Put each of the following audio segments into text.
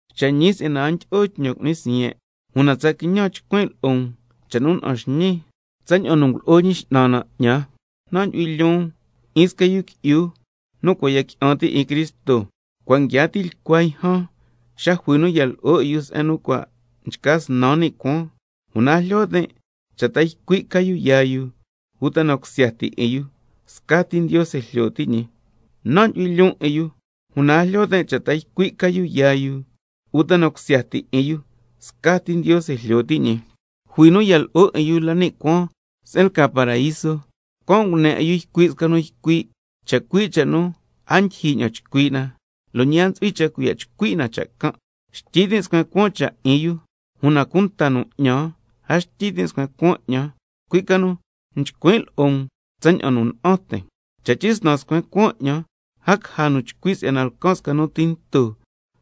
Cha' ñi si'yana a ndyi'o tñan cu'nin siyen', una tsa quiñan chcuin' lo'o um cha' nu na'an xñiin tsaña'an nu ngulo'o Ñi X'nan na 'ñan. Nan' ndyu'hui lyoon 'in sca yu qui'yu nu cua' ya qui'an ti' 'in Cristo, cua' nguiaa tilcua yjan xa jui nu ya lo'o 'in yu se'en nu cua' nchca snan ni' cuaan, (una a jlyo tin' cha' ta ycui' ca yu yaa yu uta na cusya ti 'in yu, scati Ndiose jlyo ti' ñi), nan' ndyu'hui lyoon 'in yu, (una a jlyo tin' cha' ta ycui' ca yu yaa yu uta na cusya ti 'in yu, scati Ndiose jlyo ti' ñi), jui nu ya lo'o 'in yu la ni' cuaan se'en lca paraíso, can' ngune 'in yu ycui' sca nu ycui' chacui' cha' nu a ndyijyi ña'an chcui' na, lo' ñi a ntsu'hui cha' cuiya' chcui' na cha' can'. Xtyi tin' scuen cuaan cha' 'in yu, una cunta nu 'ñan a xtyi tin' scuen cuaan 'ñan, cui' ca nu chcuin' lo'o um tsaña'an nu na'an tin'. Cha' tyisnan scuen cuaan 'ñan, a caja nu chcui' si'yana lcan sca nu tinto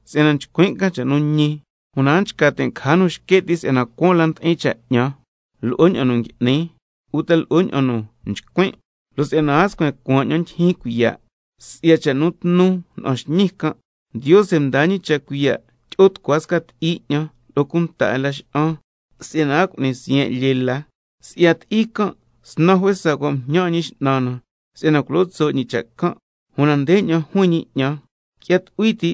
si'yana chcuin' can cha' nu ñi, una a nchca tin' caja nu xque' ti' si'yana cuaan la ndi'in cha' 'ñan lo'o ña'an nu ngui'nin, uta lo'o ña'an nu nchcuin'. Lo' si'yana a scuen cuaan 'ñan ndyijyin cuiya' si'ya cha' tnu nu na'an xñiin can', Ndiose mdaa cha' cuiya' tyi'o tucua sca ti'i 'ñan lo'o cunta 'in Laxa'an, si'yana a cu'nin siyen' lyee la. Si'ya ti'i can' snan juesa cua' mjñan 'in Ñi X'nan na si'yana culo tso' ñi cha' can'. Una ndeña'an juin ñi 'ñan: Qui'ya tucui ti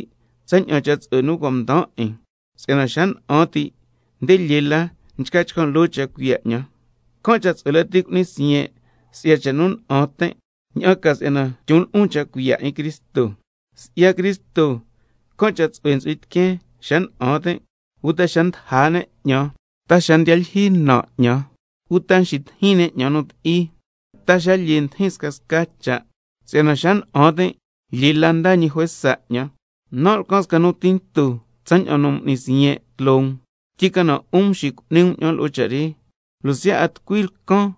tsaña'an cha' tsu'hue nu cua' mdaan 'in, si'yana xa na'an ti' nde lyee la nchca chcan' loo cha' cuiya' 'ñan. Can' cha' tsu'hue lati cu'nin siyen' si'ya cha' nu na'an tin', ña'an ca si'yana tyon lo'on cha' cuiya' 'in Cristo. Si'ya Cristo, can' cha' tsu'hue ntsu'hui tiqueen xa na'an tin', uta xa ndaja ne' 'ñan, ta xa ndiya lyijyi na 'ñan, uta nxitijin ne' 'ñan nu ti'i, ta xa lyee ndijin scasca cha', si'yana xa na'an tin' lyee la ndaa ñi juesa 'ñan. Nan' lcan sca nu tinto tsaña'an nu m'nin siyen' tloo um, tyicana 'un mxicu'ni um 'ñan lo'o cha' re. Lo' siya' a tucui lcan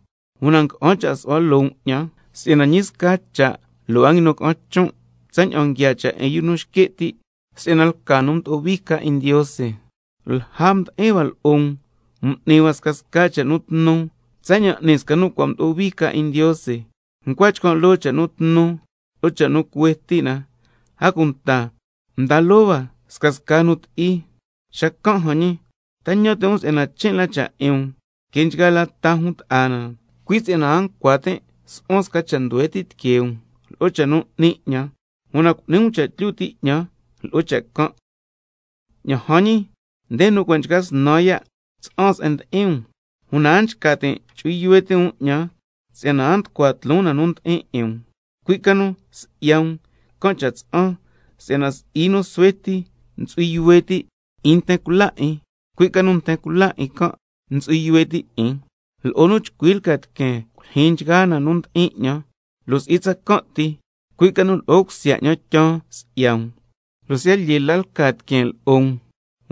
una nga'an cha' su'hua loo um 'ñan, si'yana ñi sca cha' lo' a nguinun ca'an chon' tsaña'an nguiaa cha' 'in yu nu nxque' ti' si'yana lca nu mdo'o hui ca 'in Ndiose. Lja mdi'in hua lo'o um m'ni hua scasca cha' nu tnu tsaña'an n'ni sca nu cua' mdo'o hui ca 'in Ndiose, ncua chcan' loo cha' nu tnu lo'o cha' nu cuhue ti' na, a cunta mda loo hua scasca nu ti'i. Xacan' jan ñi, ¿ta ñan ti' um si'yana chin' la cha' 'in um que nchgaa la ña'an ta jun ta'a na, cui' si'yana a ncua tin' su'huan sca cha' nduhue ti' tiquee um lo'o cha' nu 'ni 'ñan? ¡Una cu'ni um cha' tlyu ti' 'ñan lo'o cha' can'! Ña'an jan ñi, nde nu cua' nchca snan ya' tsa'an se'en ndi'in um, una a nchca tin' chu'hui yuhue ti' um 'ñan, si'yana a nducua tloon na nu ndi'in 'in um, cui' ca nu si'ya um can' cha' tsa'an, si'yana si'i nu suhue ti ntsu'hui yuhue ti' 'in nten cula 'in, cui' ca nu nten cula 'in can' ntsu'hui yuhue ti' 'in. Lo'o nu chcui lca tiqueen culyijyin nchgaa na nu ndi'in 'ñan, lo' si'i tsacan' ti, cui' ca nu lo'o cusya 'ñan tyaan si'ya um, lo' siya' lyee la lca tiqueen lo'o um,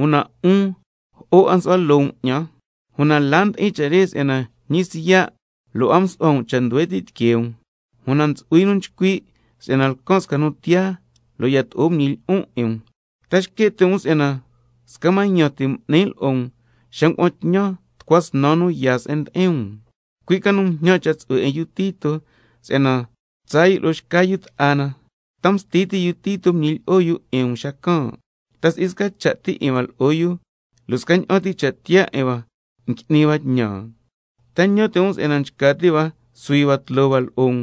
una 'un jo'o 'a nsu'hua loo um 'ñan. Una la ndi'in cha' re si'yana ñi siya' lo' a msu'huan cha' nduhue ti' tiquee um, una ntsu'hui nu nchcui' si'yana lcan sca nu tiyaa, lo' yato'o nguñilyi'on 'in um. ¿Ta xque' ti' um si'yana sca mañan ti m'nin lo'o um xa ngua'an tñan tucua snan yu nu yaa se'en ndi'in um? Cui' ca nu mjñan cha' tsu'hue 'in yu Tito si'yana tsaa yu lo'o xca yu ta'a na. ¿Ta msti ti' yu Tito nguñilyi'o yu 'in um xacan'? ¿Ta si'i sca cha' ti 'in hua lo'o yu, lo' scaña'an ti cha' tiyaa 'in hua ngui'ni hua tñan? ¿Ta ñan ti' um si'yana nchca ti' hua suhui hua tloo hua lo'o um?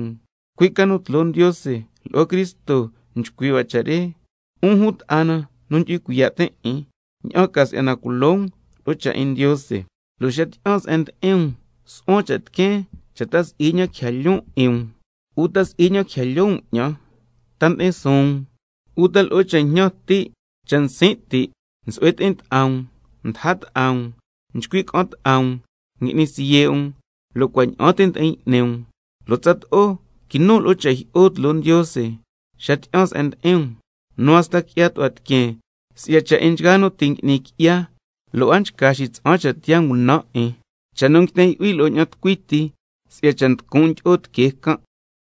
Cui' ca nu tloo Ndiose lo'o Cristo nchcui' hua cha' re, 'un jun ta'a na nu ndyu'hui cuiya' tin' 'in, ña'an ca si'yana culo um lo'o cha' 'in Ndiose. Lo' xa tyi'an se'en ndi'in um nsu'huan cha' tiqueen cha' ta si'i ña'an quija lyoon 'in um, uta si'i ña'an quija lyoo um 'ñan, ta ndi'in suun um, uta lo'o cha' jñan ti', cha' nsin' ti', nsu'hue ti'in ta'a um, ndaja ta'a um, nchcui' ca'an ta'a um, ngui'ni siye' um, lo' cua' ña'an ti ndi'in y'ni um, lo' tsato'o quinun lo'o cha' jyi'o tloo Ndiose xa tyi'an se'en ndi'in um, nu hasta qui'ya tu'hua tiqueen si'ya cha' 'in nchgaa nu ti' ngui'ni qui'ya lo' a nchca xitsa'an cha' tiyaa ngunan' 'in, cha' nu nguiten yu'hui lo'o ña'an tucui ti si'ya cha' nducun' ndyi'o tiquee can'.